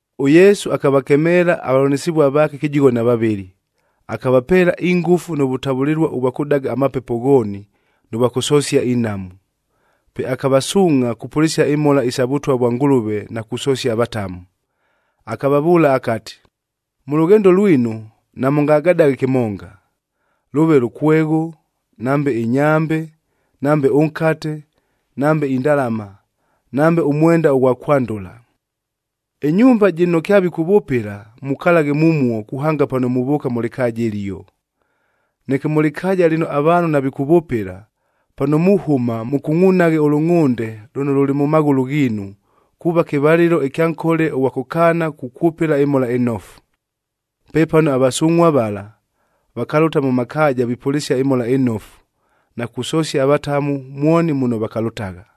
ɄYesu akavakemeela avavʉlanɨsɨvua vaake kɨjigho na vavɨlɨ. Akavapeela ingʉfu nʉ vʉtavʉlɨlua ʉvwa kʉdaga amapepo ghooni, nʉ vwa kʉsosia inhamu. Pe akavasuungʼha kupʉlɨsia imhola isa Vʉtwa vwa Ngʉlʉve na kusosia avatamu. Akavavʉʉla akati, “Mʉ lʉghendo lwinu, namʉngagadaghe kɨmonga: lʉʉve lʉkwegho, nambe ɨnyambe, nambe ʉnkate, nambe indalama, nambe ʉmwenda ʉghwa kwandʉla. Ɨnyumba jɨno kyavikʉvʉpɨla, mukalaghe mumuo kuhanga pano muvʉʉka mʉ lɨkaaja ɨlio. Neke mʉ lɨkaaja lɨno avaanhu navikʉvʉpɨla, pano muhʉma mʉkungʼunaghe ʉlʉngʼhʉnde lʉno lʉlɨ mʉ maghʉlʉ ghiinu,a kuuva kɨvalɨlo ɨkya nkole ʉghwa kʉkaana kukwʉpɨla ɨMhola ɨNofu.” Pepano avasungʼhua vala, vakalʉta mʉ makaaja vipʉlɨsia ɨMhola ɨNofu, na kusosia avatamu mwoni muno vakalʉtagha.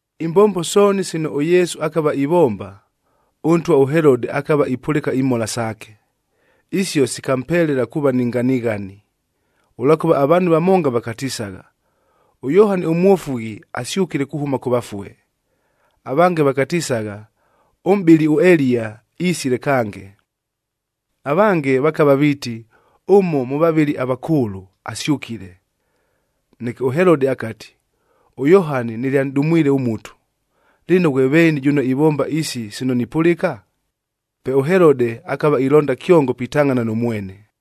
Imbombo sooni sino ʉYesu akava ivomba, ʉntwa ʉHelode akava ipʉlɨka imhola saake. Isio sikampelela kuuva ni nganighani, ʉlwakʉva avaanhu vamonga vakatisagha, ʉYohani ʉMwofughi asyʉkile kuhʉma kʉ vafue. Avange vakatisagha, ʉmʼbɨli ʉEliya isile kange. Avange vakava viiti, ʉmo mʉ vavɨli avakʉʉlʉ, asyʉkile. Neke ʉHelode akati, “ɄYohani nɨlyanʼdumwile ʉmutu! Lɨno, ghwe veeni jʉno ivomba isi sino nipʉlɨka?” Pe ʉHelode, akava ilonda kyongo pitangʼhana nʉ mwene.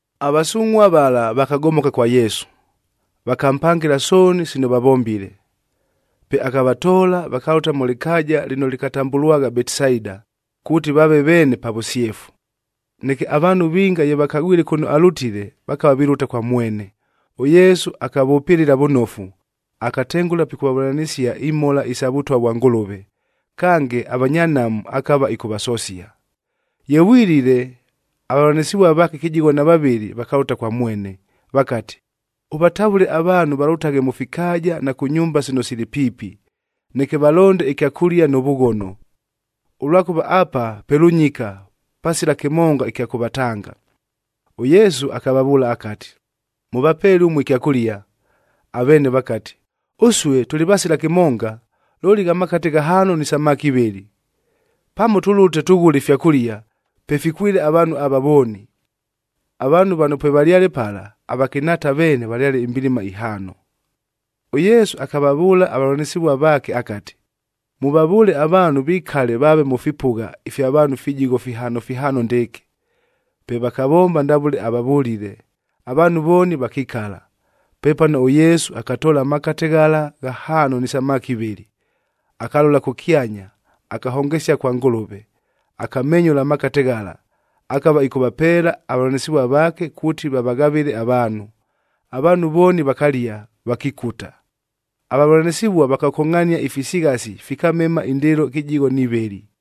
Avasungʼhua vala vakagomoka kwa Yesu, vakampangɨla sooni sino vavombile. Pe akavatoola vakalʉta mʉ lɨkaaja lɨno lɨkatambʉlwagha Betisaida, kuuti vaave veene pa vʉsyefu. Neke avaanhu vinga ye vakagwile kʉno alʉtile, vakava vilʉta kwa mwene. ɄYesu akavʉpɨlɨla vʉnofu, akatengʉla pikʉvavʉlanɨsia imhola isa Vʉtwa vwa Ngʉlʉve. Kange, avanya nhamu akava ɨkʉvasosia. Ye vwilile, avavʉlanɨsɨvua vaake kɨjigho na vavɨlɨ vakalʉta kwa mwene, vakati, “Ʉvatavʉle avaanhu valʉtaghe mʉ fikaaja na kʉ nyumba sino sili piipi, neke valonde ɨkyakʉlia nʉ vʉghono, ʉlwakʉva apa pe lʉnyika pasila kɨmonga ɨkya kʉvatanga.” ɄYesu akavavʉʉla akati, “Mʉvapeele ʉmue ɨkyakʉlia!” Aveene vakati, “Ʉsue tʉlɨ vasila kɨmonga, looli gha makate ghahaano ni samaki ivɨlɨ. Pamo tʉlʉte tʉghʉle ifyakʉlia, pe fikwɨle avaanhu ava vooni!” Avaanhu vano pwevalyale pala, avakɨnhaata veene valyale imbilima ihaano. ɄYesu akavavʉʉla avavʉlanɨsɨvua vaake akati, “Mʉvavʉʉle avaanhu vikale vaave mʉ fipʉgha ifya vaanhu fijigho fihaano fihaano ndɨɨkɨ.” Pe vakavomba ndavʉle avavʉlile, avaanhu vooni vakikala. Pepano ʉYesu akatoola amakate ghala ghahaano ni samaki ivɨlɨ, akalola kʉkyanya, akahongesia kwa Ngʉlʉve. Akamenyʉla amakate ghala, akava ɨkʉvapeela avavʉlanɨsɨvua vaake kuuti vavaghavɨle avaanhu. Avaanhu vooni vakalia, vakikuta. Avavʉlanɨsɨvua vakakongʼhania ifisighasi, fikamema indɨɨlo kɨjigho ni vɨlɨ.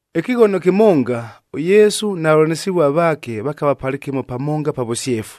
Ɨkɨghono kɨmonga, ʉYesu na vavʉlanɨsɨvua vaake vakava palɨkɨmo pamonga pa vʉsyefu.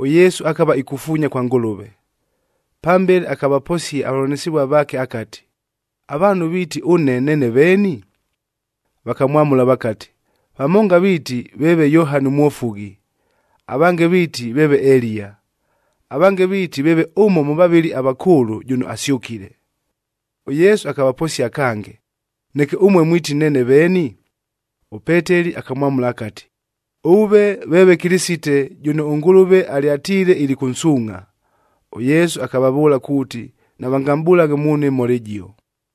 ɄYesu akava ikufuunya kwa Ngʉlʉve. Pambele akavaposia avavʉlanɨsɨvua vaake akati, “Avaanhu viiti, ʉne neene veeni?” Vakamwamʉla vakati, “Vamonga viiti, veeve Yohani ʉMwofughi, avange viiti veeve Eliya. Avange viiti veeve ʉmo mʉ vavɨli avakʉʉlʉ jʉno asyʉkile.” ɄYesu akavaposia kange, “Neke ʉmue mwiti, neene veeni?” ɄPeteli akamwamʉla akati, “Ʉve veeve Kɨlɨsite, jʉno ʉNgʉlʉve alyatiile ilikʉnsuungʼha!” ɄYesu akavavʉʉla kuuti, navangamʼbʉlaghe muunhu ɨmhola ɨjio.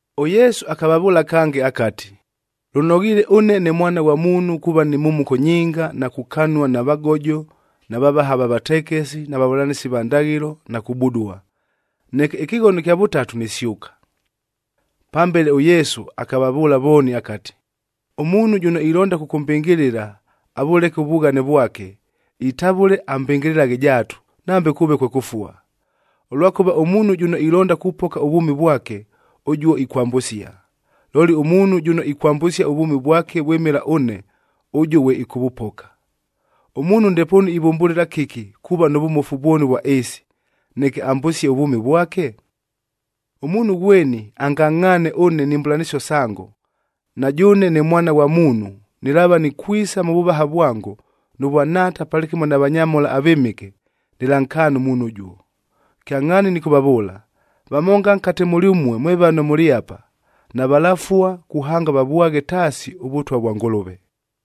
ɄYesu akavavʉʉla kange akati, “Lʉnoghiile ʉne ne Mwana ghwa Muunhu kuuva ni mhumuko nyinga na kukanua na vagojo na vavaha va vatekesi na vavʉlanɨsi va ndaghɨlo,b na kubudua. Neke ɨkɨghono ɨkya vʉtatu nisyʉka.” Pambele, ʉYesu akavavʉʉla vooni akati, “Ʉmuunhu jʉno ilonda kʉkʉmbɨngɨlɨla, avʉleke ʉvughane vwake, itavʉle ambɨngɨlɨlaghe jaatu, nambe kʉʉve kwe kʉfua. Ʉlwakʉva ʉmuunhu jʉno ilonda kupoka ʉvwʉmi vwake, ʉjuo ikwambʉsia, looli ʉmuunhu jʉno ikwambʉsia ʉvwʉmi vwake vwɨmɨla ʉne, ʉjuo ghwe ɨkʉvʉpoka. Ʉmuunhu ndepoonu ivʉmbʉlɨla kɨki kuuva nʉ vʉmofu vwoni ʉvwa ɨɨsi, neke ambʉsie ʉvwʉmi vwake? Ʉmuunhu ghweni angangʼhaane ʉne ni mbʉlanɨsio sango, na jʉʉne ne Mwana ghwa Muunhu, nɨlaava nikwisa mʉ vʉvaha vwango, nʉ vwa Nhaata palɨkɨmo na vanyamhola avɨmɨke, nɨlankaana ʉmuunhu ʉjuo. Kyangʼhaani nɨkʉvavʉʉla, vamonga nkate mʉlyʉmue mwe vano mʉlɨ apa, navalafua kuhanga vavwaghe taasi ʉVʉtwa vwa Ngʉlʉve.”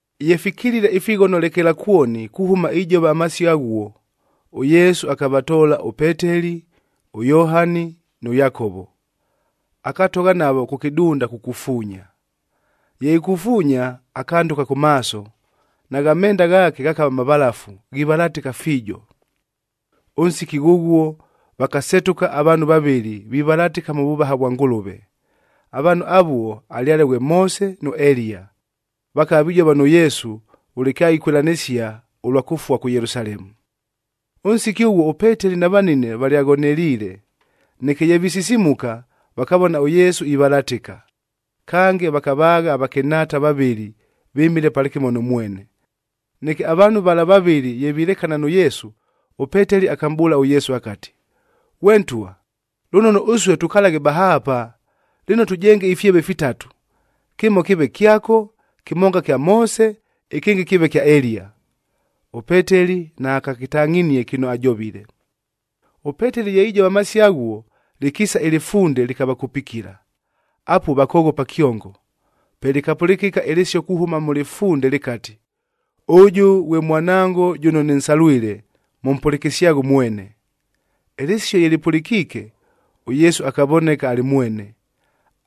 Ye fikilile ifighono lekelakwoni, kuhʉma ijova amasio aghuo, ʉYesu akavatoola ʉPeteli, ʉYohani, nʉ Yakovo, akatogha navo kʉ kɨdunda kukufuunya. Ye ikufuunya, akandʉka kʉ maaso, nagha menda ghaake ghakava mavalafu, ghivalatɨka fiijo. Ʉnsiki ghʉghuo, vakasetʉka avaanhu vavɨlɨ vivalatɨka mʉ vʉvaha vwa Ngʉlʉve. Avaanhu avuo alyale ghwe Moose nʉ Eliya, vakava vijova nʉ Yesu, vʉle kyaikwɨlanɨsia ʉlwa kʉfua kʉ Yelusalemu. Ʉnsiki ʉghuo ʉPeteli na vanine valyaghoneliile. Neke ye visisimuka, vakavona ʉYesu ivalatɨka. Kange, vakavaagha avakɨnhaata vavɨlɨ vɨmile palɨkɨmo nʉ mwene. Neke avaanhu vala vavɨlɨ ye vilekana nʉ Yesu, ʉPeteli akamʼbʉʉla ʉYesu akati, “Ghwe Ntwa, lʉnono ʉsue tukalaghe bahaapa. Lɨno, tʉjenge ifyeve fitatu: kɨmo kɨɨve kyako, kɨmonga kya Moose, ɨkɨngɨ kɨɨve kya Eliya.” ɄPeteli naakakɨtangʼhinie kɨno ajovile. ɄPeteli ye ijova amasio aghuo, lɨkiisa ɨlɨfunde lɨkavakupikila. Apuo vakoghopa kyongo. Pe lɨkapʉlɨkɨka ɨlɨsio kuhʉma mʉ lɨfunde lɨkati, “Ʉjʉ ghwe Mwanango jʉno nɨnsalwile, mʉmpʉlɨkɨsyaghe ʉmwene!” Ɨlɨsio ye lɨpʉlɨkiike, ʉYesu akavoneka alɨ mwene.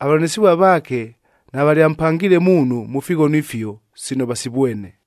Avavʉlanɨsɨvua vaake navalyampangiile muunhu mʉ fighono ifio, sino vasivwene.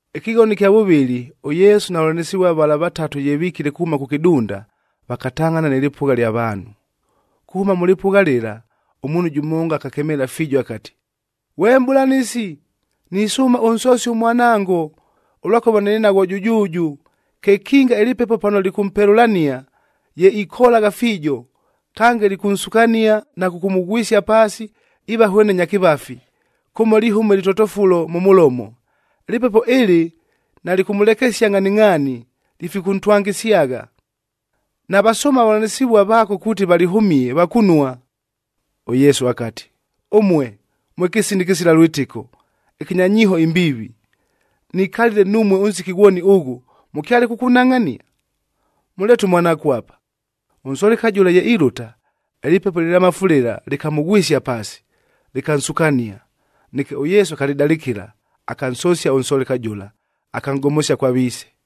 Ɨkɨghono ɨkya vʉvɨlɨ, ʉYesu na vavʉlanɨsɨvua vala vatatu ye vikile kuhʉma kʉ kɨdunda, vakatangʼhana nɨ lɨpʉgha lya vaanhu. Kuhʉma mʉ lɨpʉgha lɨla, ʉmuunhu jʉmonga akakemeela fiijo akati, “Ghwe Mʼbʉlanɨsi, nisʉʉma ʉnsosie ʉmwanango, ʉlwakʉva nɨlɨ naghwo jʉjʉʉjʉ. Kekinga ɨlɨpepo pano lɨkʉmpelʉlania, ye ikolagha fiijo. Kange, lɨkʉnsukania na kʉkʉmʉghwɨsia paasi iiva hwene nya kɨvafi, kʉmo lihʉma ɨlɨtotofulo mʉ mʉlomo. Ɨlɨpepo ɨlɨ nalɨkʉmʉlekesia ngʼhaningʼhaani, lifikʉntwangɨsyagha. Navasʉʉma avavʉlanɨsɨvua vaako kuuti valɨhʉmie, vakunua.” ɄYesu akati, “Ʉmue, mwe kɨsina ɨkɨsila lwɨtɨko, ɨkɨnya nyiiho imbiivi! Nikalile numue ʉnsiki ghwoni ʉghʉ, mʉkyale kʉkʉnhangʼhania? Mʉleete ʉmwanaako apa.” Ʉnsoleka jʉla ye ilʉta, ɨlɨpepo ɨlɨlamafu lɨla lɨkamʉghwɨsia paasi, lɨkansukania. Neke ʉYesu akalɨdalɨkɨla, akansosia ʉnsoleka jʉla, akanʼgomosia kwa viise.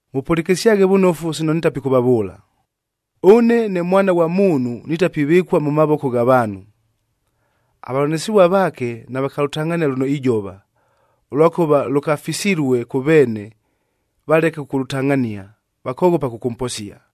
“Mʉpʉlɨkɨsyaghe vʉnofu sino nitapikʉvavʉʉla! Ʉne ne Mwana ghwa Muunhu nitapivɨkua mʉ mavoko gha vaanhu.” Avavʉlanɨsɨvua vaake navakalʉtangʼhania lʉno ijova, ʉlwakʉva lʉkafisilue kʉ veene valeke kʉkʉlʉtangʼhania, vakoghopa kʉkʉmposia.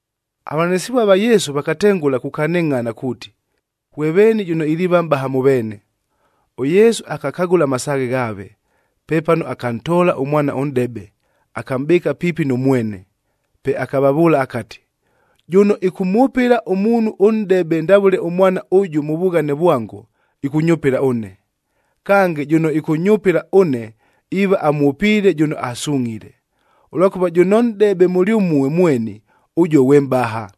Avavʉlanɨsɨvua va Yesu vakatengʉla kukanɨngʼhana kuuti, ghwe veeni jʉno iliiva mʼbaha mʉ veene. ɄYesu akakagʉla amasaaghe ghaave. Pepano akantoola ʉmwana ʉnʼdebe, akamʼbɨɨka piipi nʉ mwene, pe akavavʉʉla akati, “Jʉno ɨkʉmwʉpɨla ʉmuunhu ʉnʼdebe ndavʉle ʉmwana ʉjʉ mʉ vughane vwango, ɨkʉnyʉpɨla ʉne. Kange, jʉno ɨkʉnyʉpɨla ʉne, iiva amwʉpiile jʉno asungʼhile. Ʉlwakʉva jʉno nʼdebe mʉlyʉmue mweni, ʉjuo ghwe mʼbaha.”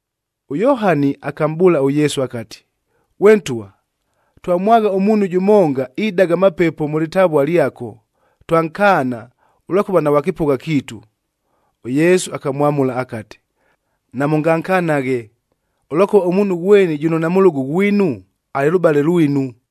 ɄYohani akamʼbʉʉla ʉYesu akati, “Ghwe Ntwa, twamwagha ʉmuunhu jʉmonga idaga amapepo mʉ lɨtavua lyako, twankaana, ʉlwakʉva naghwa kɨpʉgha kiitu.” ɄYesu akamwamʉla akati, “Namʉngankanaghe, ʉlwakʉva ʉmuunhu ghweni jʉno namʉlʉgʉ ghwinu, alɨ lʉbale lwinu.”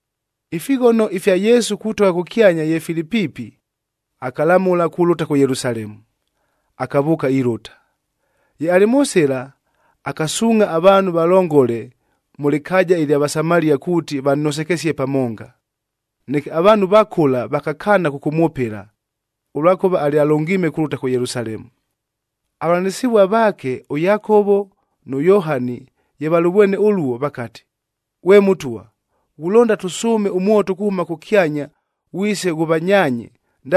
Ifighono ifya Yesu kutogha kʉkyanya ye fili piipi, akalamʉla kulʉta kʉ Yelusalemu, akavʉʉka ilʉta. Ye alɨ mʉ sɨla, akasuungʼha avaanhu valongole mʉ lɨkaaja ɨlya Vasamaliac kuuti vannosekesie pamonga. Neke avaanhu va kʉla vakakaana kʉkʉmwʉpɨla, ʉlwakʉva alyalʉngiime kulʉta kʉ Yelusalemu. Avavʉlanɨsɨvua vaake, ʉYakovo nʉ Yohani ye valʉvwene ʉluo, vakati, “Ghwe Mʉtwa, ghulonda tʉsʉʉme ʉmwoto kuhʉma kʉkyanya ghwise ghʉvanyaanye,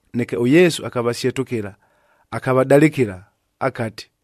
Neke ʉYesu akavasyetʉkɨla, akavadalɨkɨla. Akati,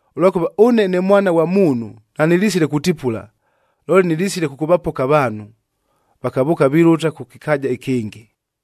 Ʉlwakʉva ʉne ne Mwana ghwa Muunhu nanɨlisile kutipula, looli nɨlisile kʉkʉvapoka avaanhu.” Vakavʉʉka vilʉta kʉ kɨkaaja ɨkɨngɨ.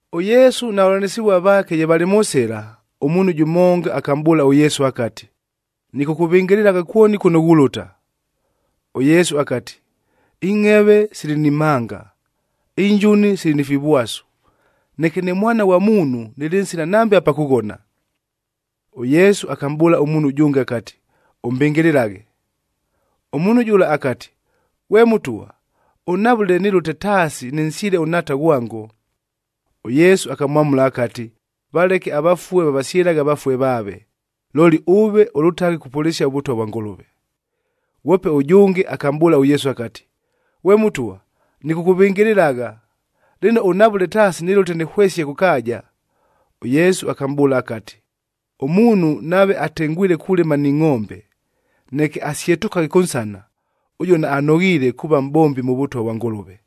ɄYesu na vavʉlanɨsɨvua vaake ye valɨ mʉ sɨla, ʉmuunhu jʉmonga akamʼbʉʉla ʉYesu akati, “Nɨkʉkʉvɨngɨlɨlagha kwoni kʉno ghulʉta!” ɄYesu akati, “Ingʼheve sili ni mhanga, injuni sili ni fivwasu, neke ne Mwana ghwa Muunhu, nɨlɨ nsila nambe apa kʉghona.” ɄYesu akamʼbʉʉla ʉmuunhu ʉjʉnge akati, “Ʉmbɨngɨlɨlaghe!” Ʉmuunhu jʉla akati, “Ghwe Mʉtwa, ʉnhavʉle nɨlʉte taasi nɨnsyɨle ʉnhaata ghwango.” ɄYesu akamwamʉla akati, “Valeke avafue vavasyɨlaghe avafue vaave. Looli ʉve, ʉlʉtaghe kupʉlɨsia ʉVʉtwa vwa Ngʉlʉve.” Ghwope ʉjʉnge akamʼbʉʉla ʉYesu akati, “Ghwe Mʉtwa, nɨkʉkʉvɨngɨlɨlagha. Lɨno, ʉnhavʉle taasi nɨlʉte nɨhwesie kʉ kaaja.” ɄYesu akamʼbʉʉla akati, “Ʉmuunhu nave atengwile kulɨma ni ngʼombe, neke asyetʉkaghe kʉnsana, ʉjuo naanoghiile kuuva mʼbombi mʉ Vʉtwa vwa Ngʉlʉve.”